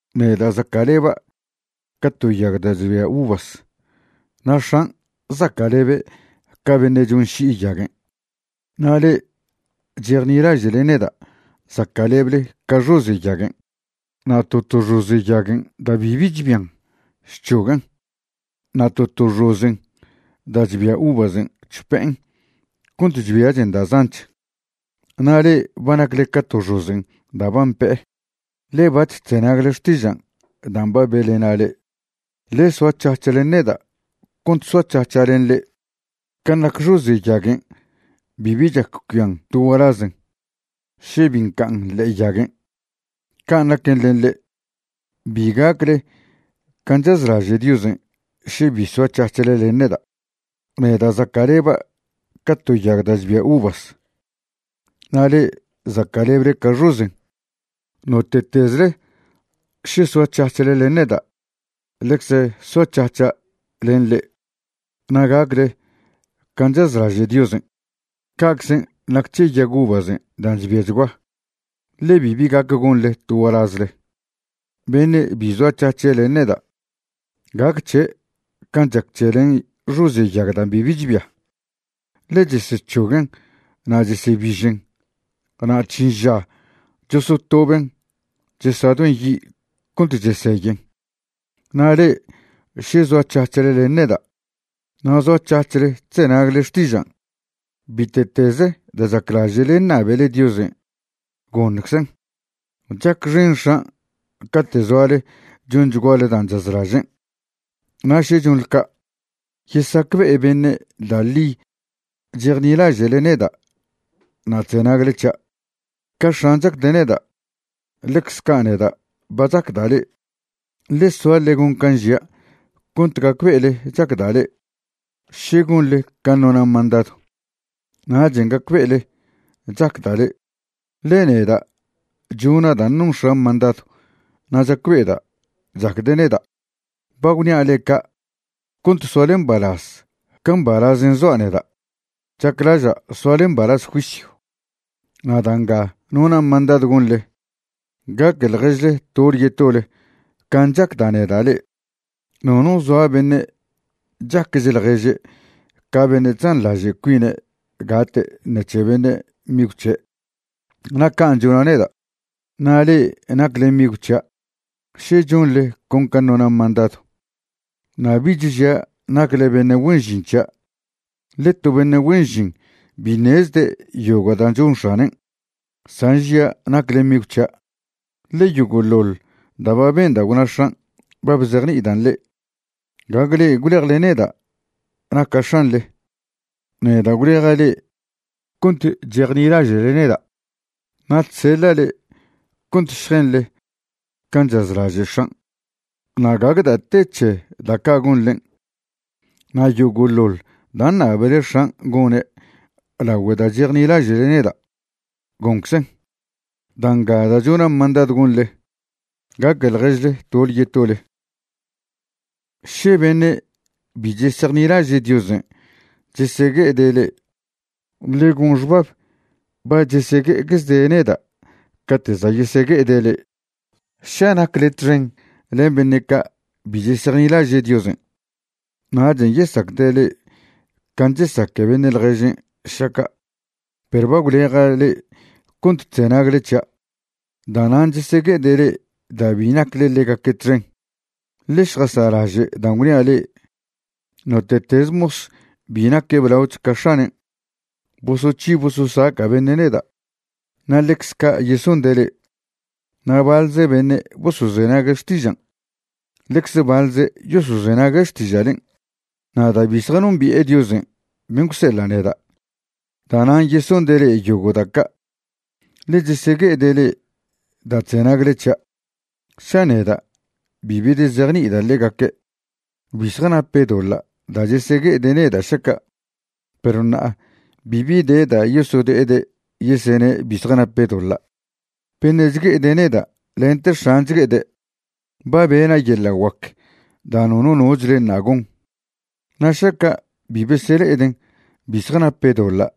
’Neda' zaca'leba' ca to yag da' chbia uvas. Na' X̱an' zaca'lebe' ca beṉe' chonši'i yaguen'. Na' le'e chejnilaže'le neda' zaca'leble ca xoze' yaguen'. Na' to to xoze' yaguen' da' bibi chbian, chc̱hoguen'. Na' to to xozen' da' chbia uvasen' chpe'en cont chbiachen da' zanch. Na' le'e ba nacle ca to xozen' da' ba mpe'e, ḻe bac̱h chzenagle xtižan' dan' ba be'lena' le'e. Ḻe soac̱hac̱h len neda' cont soac̱hac̱ha' len le'e. Can' nac xoze' yaguen' bibi chac cuian to gualazen še bi nca'an ḻe'e yaguen', can' naquen len le'e, bi gacle can' chazlaže' Diosen' še bi soac̱hac̱hle len neda'. ’Neda' zaca'leba' ca to yag da' chbia uvas na' le'e zaca'leble ca xozen'. Note'tezle še soac̱hac̱hle len neda' ḻecze soac̱hac̱ha' len le'e na' gacle can' chazlaže' Diosen', ca'aczen' nac c̱he yag uvazen' dan' chbiachgua, ḻe bibi gac gonḻe to gualazle. Beṉe' bi zoac̱hac̱he' len neda', gac c̱he' can' chac len xoze' yag da' bibi chbia, ḻe chesec̱hoguen' na' chesebižen na' chžin ža chosotoben' chesadoen' yi' cont cheseyen. ’Na' le'e še zoac̱hac̱hle len neda' na' zoac̱hac̱hle chzenagle xtižan', bite'tez da' chaclaže'le ṉabele Diosen', goṉczen'. Chacxen X̱an' cate' zoale chonchguale dan' chazlažen', na' še chonḻe ca', yesacbe'e beṉe' da' ḻi chejnilaže'le neda' na' chzenagle c̱hia'. Ca X̱an' chacde' neda', ḻecz ca' neda' ba chacda' le'e. Ḻe soa ḻe gon can' žia' cont gacbe'ele chacda' le'e. Še gonḻe can' nona' mandadw, nachen' gacbe'ele chacda' le'e, ḻe neda' chona' dan' non X̱an' mandadw na' chacbe'eda' chacde' neda'. ’Ba gwnia' le'e ca' cont soale mbalaz ca mbalazen' zoa' neda'. Chaclaža' soale mbalaz juisyw. Na' da' nga nona' mandadw gonḻe, gaque ḻježle tole yetole can' chacda' neda' le'e. Nono zoa beṉe' chaquech ḻježe' ca beṉe' chzanḻaže' cuine' gate' ṉec̱he beṉe' migw c̱he'. Na' can' chona' neda'. Na' le'e nacle migw c̱hia' še chonḻe con can' nona' mandadw. Na' bich žia' nacle beṉe' güen žin c̱hia', ḻe to beṉe' güen žin bi ṉezde' yogo' da' chon x̱anen', san žia' nacle migw c̱hia'. Ḻe yogo'ḻoḻ da' ba benda' gwna X̱an' ba bzejni'idan' le'e. Gague le'e gwlejle neda' naca' X̱anḻe. Neda' gwleja' le'e cont chejnilaže'le neda'. Na' chseḻa' le'e cont šjenḻe can' chazlaže' X̱an', na' gague da' te c̱he da' ca' gonḻen'. Na' yogo'ḻoḻ da' ṉabele X̱an' gone' lagüe da' chejnilaže'le neda', gonczen'. Da' nga da' chona' mandadw gonḻe, gaque ḻježle tole yetole. ’Še beṉe' bi chesejnilaže' Diosen' chesegue'ede' le'e, ḻe gon xbab ba chesegue'eczede' neda' cate' za' yesegue'ede' le'e. Ša nacle txen len beṉe' ca' bi chesejnilaže' Diosen', nachen' yesacde' le'e can' chesaque' beṉe' ḻježen' šaca'. Perw ba gwleja' le'e cont chzenagle c̱hia'. Da'nan' chesegue'ede' le'e da' bi nacle ḻegaque' txen. Ḻe šjasa'laže' dan' gwnia' le'e: “Note'teze mos bi naque' blaoch ca x̱anen'.” Bosoc̱hi bososaca' beṉe' neda', na' ḻecz ca' yesonde' le'e. Na' baḻze beṉe' bosozenague' xtižan', ḻecze baḻze' yosozenague' xtiža'len'. Na' da' bi zjanombi'e Diosen' ben' gwseḻa' neda', da'nan' yesonde' le'e yogo' da' ca', ḻe chesegue'ede' le'e da' chzenagle c̱hia'. ’Ša neda' bi bedezejni'ida' ḻegaque', bi zjanape' doḻa' da' chesegue'ede' neda' šaca'. Perw ṉa'a bibi de da' yosode'ede' yesene' bi zjanape' doḻa'. Beṉe' chgue'ede' neda' lente X̱an' chgue'ede'. Ba bena' yeḻa' guac da' nono nochle ṉa' gon, na' šaca' bi besele'eden' bi zjanape' doḻa'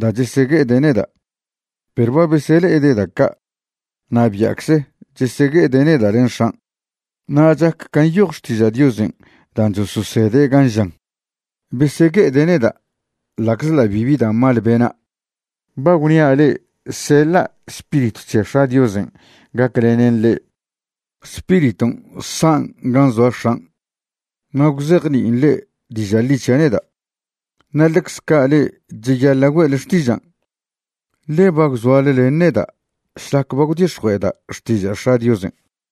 da' chesegue'ede' neda'. Perw ba besele'ede' da' ca' na' bia'cze chesegue'ede' neda' len X̱an'. Na' chac can' nyoj Xtiža' Diosen' dan' chososede' gan' žan: “Besegue'ede' neda' ḻa'czḻa' bibi da' mal bena'.” ’Ba gwnia' le'e seḻa' Spiritw c̱he X̱a' Diosen' gaclenen le'e. Spiriton' san' gan' zoa X̱an' na' gwzejni'in le'e diža' ḻi c̱hia' neda'. Na' ḻecz ca' le'e cheyaḻa' güe'le xtižan', ḻe ba gwzoale len neda' šlac ba gwdix̱jue'eda' xtiža' X̱a' Diosen'.